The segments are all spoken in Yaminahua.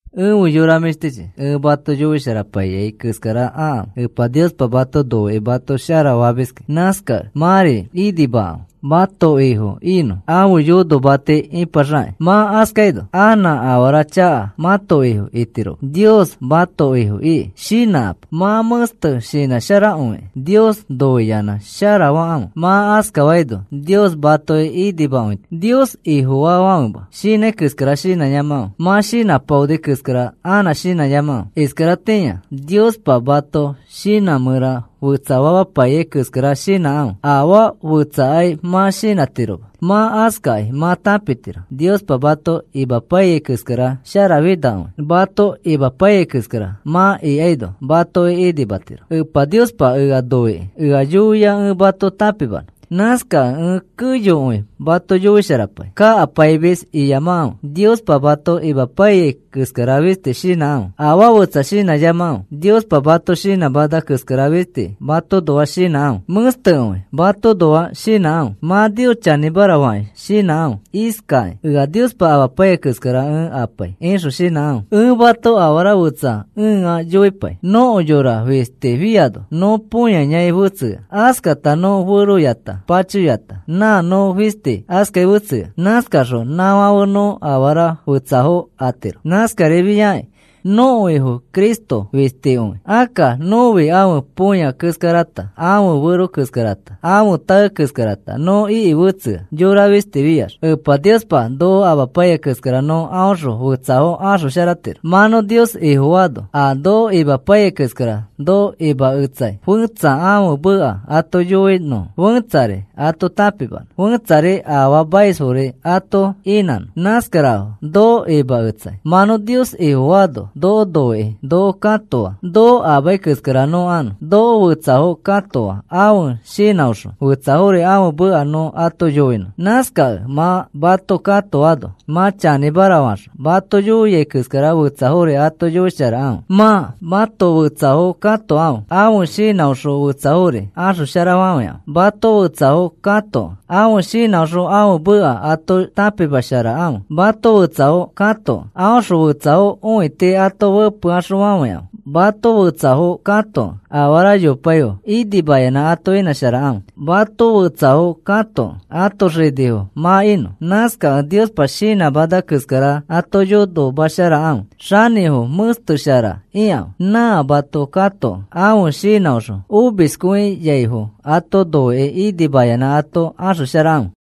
Efe yora mĩshtichi, ẽ mato yoisharapaiyai keskara akãfe. Epa Niospa mato noikĩ mato sharafamiski. Nãskakẽ mãri inãmekãfe mãto Ifo inõ, ãfe yonomati ipaxakakĩ. Mã askaino anã afara chaka mãto ifo itiroma, Nios mãto Ifo iki. Shinãkapo. Mã mẽste shinãsharakõikĩ Nios noiyanã sharafakãfe. Mã askafaino Nios matoki inimakõitiro. Nios Ifofaafãfema shinãi keskara shinãyamakãfe. Mã shinãpaoni keskara anã shinãyamakãfe. Iskaratĩa Niospa mãto shinã mẽra fetsafapaiyai keskara shinãkãfe. Afaa fetsakai mã shinãtiroma. Mã askakĩ mã tãpitiro Niospa mato imapaiyai keskara sharafinakõi. Mato imapaiyai keskara mã ikaino matoki inimatiro. Epa Niospa ea noikĩ ea yoia ẽ mato tãpimanõ. Nãskakẽ ẽ keyokõi mato yoisharapai. Kakapaimis iyamakãfe. Niospa mato imapaiyai keskara fisti shinãkãfe. Afaa fetsa shinãyamakãfe. Niospa mato shinãmana keskara fisti matoõnoa shinãkãfe. Mẽstekõi matoõnoa shinãkãfe. Mã Nios chanĩmara fakĩ shinãkãfe iskakĩ: “Ea Niospa imapaiyai keskara ẽ ipai,” ixõ shinãkãfe. Ẽ mato afara fetsa ẽa yoipai. Nõko yora fistifiano nõ põyayai fetsea. Askata nõ feroyata, pachoyata, nã nõ fisti askai fetsea. Nãskaxõ nãfãfe nõ afara fetsafo atiro. Nãskarifiai nõko Ifo Cristo fistikõi. Akka nõfi ãfe põya keskarata, ãfe fero keskarata, ãfe tae keskarata nõ iki fetsea yora fisti fiax. Epa Niospa noko amapaiyai keskara nõ aõxõ fetsafo axosharatiro. Mã nõ Nios Ifofaano a noko imapaiyai keskara noko imaketsai fẽtsa ãfe meka ato yoinõfo, fẽtsari ato tãpimanõ, fẽtsari afaamaisfori ato inãnõ. Nãskarafo noko imaketsai. Mã nõ Nios Ifofaano noko noikĩ noko katoa noko amai keskara nõ anõ. Noko fetsafo katoa ãfe shinãõxõ fetsafori ãfe meka nõ ato yoinõ. Nãskakẽ mã mato katoano mã chanĩmara faxõ mato yoiai keskara fetsafori ato yoisharakãfe. Mã mato fetsafo katokẽ ãfe shinãõxõ fetsafori axosharafafãikãfe. Mato fetsafo katokẽ ãfe shinãõxõ ãfe meka ato tãpimasharakãfe. Mato fetsafo katokẽ aõxõ fetsafo õiti ato fepeaxõfafãikãfe. Mato fetsafo katokẽ afara yopaifo inimayanã ato inãsharakãfe. Mato fetsafo katokẽ ãto xanĩfo mã inõ. Nãskakẽ Niospa shinãmana keskara ato yonomasharakãfe. Xanĩfo mẽsteshara ikãfe. Nã mato katokẽ ãfe shinãõxõ omiskõiaifo ato noikĩ inimayanã ato axosharakãfe.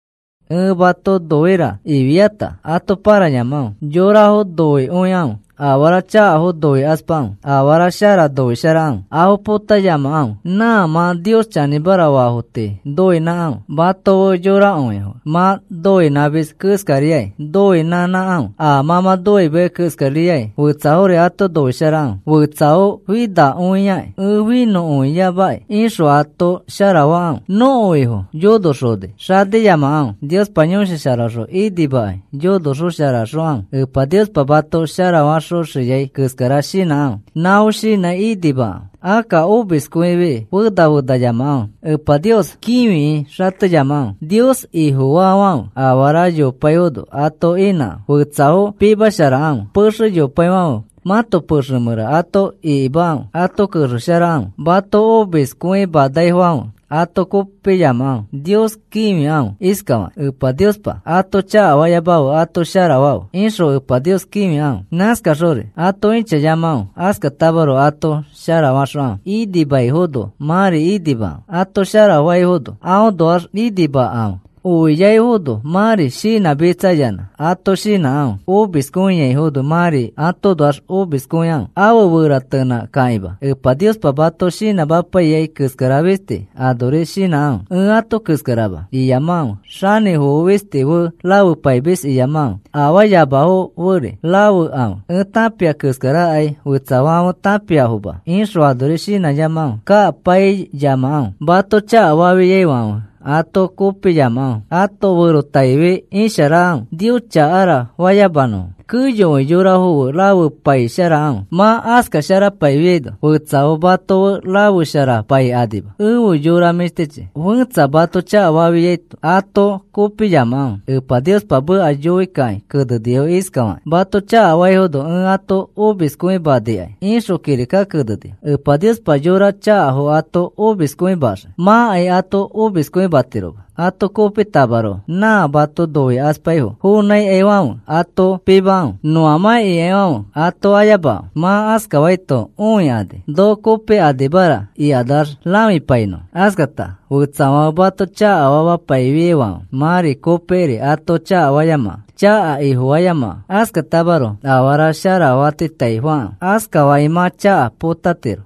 “Ẽ mato noira,” ifiata ato pãrayamakãfe. Yorafo noikõikãfe. Afara chakafo noikaspakãfe. Afara shara noisharakãfe. Afo potayamakãfe. Nã mã Nios chanĩmara faafo tii noinãkãfe. Mato fe yorakõifo fe mã noinãmis keskariai noinõnãkãfe. A mã mã nõimeai keskariai fetsafori ato noisharakãfe. “Fetsafo finakõiaki, ẽ finakõiyamaki,” ixõ ato sharafakãfe. Nõko Ifo yonoxoni xaniyamakãfe. Niospa Yõshi Sharaõxõ inimakãi yonosharaxokãfe. Epa Niospa mato sharafaxoxiai keskara shinãkãfe. Nãfo shinãi inimakãfe. Akka omiskõifi fena fenayamakãfe. Epa Nios kĩfikĩ xateyamakãfe. Nios Ifofaafãfe afara yopaifono ato inãkãfe. Fetsafo pimasharakãfe. Pexe yopaifãfe mãto pexe mẽra ato ikimakãfe. Ato kexesharakãfe. Mato omiskõimanaifãfe ato kopiyamakãfe. Nios kĩfikãfe iskafakĩ: “Epa Niospa ato chakafayamafe ato sharafafe,” ixõ Epa Nios kĩfikãfe. Nãskaxori ato ĩchayamakãfe. Askatamaroko ato sharafaxokãfe. Inimaifono mãri inimakãfe. Ato sharafaifono aõnoax inimakãfe. Oiaifono mãri shinãmitsayanã ato shinãkãfe. Omiskõiaifono mãri atoõnoax omiskõikãfe. Afe feratenãkakĩma Epa Niospa mato shinãmapaiyai keskara fisti anori shinãkãfe. “Ẽ ato keskarama,” iyamakãfe. Xanĩfofo fisti fe rafepaimis iyamakãfe. Afaayamafo feri rafekãfe. “Ẽ tãpia keskarakai fetsafãfe tãpiafoma,” ixõ anori shinãyamakãfe. Kakapaiyamakãfe. Mato chakafafiaifãfe ato kopiyamakãfe. Ãto ferotaifi isharakãfe, “Nios chakara,” fayamanõ. Keyokõi yorafo fe rafepaisharakãfe. Mã aska sharafapaifiaino fetsafo mato fe rafesharapaikanima. Efe yora mĩshtichi, fẽtsa mato chakafafiaito ato kopiyamakãfe. Epa Niospa meka yoikakĩ kenenifo iskafakakĩ: “Mato chakafaifo ẽ ato omiskõimanikai,” ixõ kirika kenenifo. Epa Niospa yora chakafo ato omiskõimaxii. Mãkai ato omiskõimatiroma. Ato kopitamaroko nã mato noikaspaifo fonãikaifãfe ato pimakãfe. Nõamã ikaifãfe ato ayamakãfe. Ma askafaito õikani, “Noko kopikanimara,” ikanax rãfipainõfo. Askata fetsafãfe mato chakafapaifiaifãfe mãri kopikiri ato chakafayamakãfe. Chaka ifofayamakãfe. Askatamaroko afara sharafatitaifakãfe. Askafakĩ mã chaka potatiro.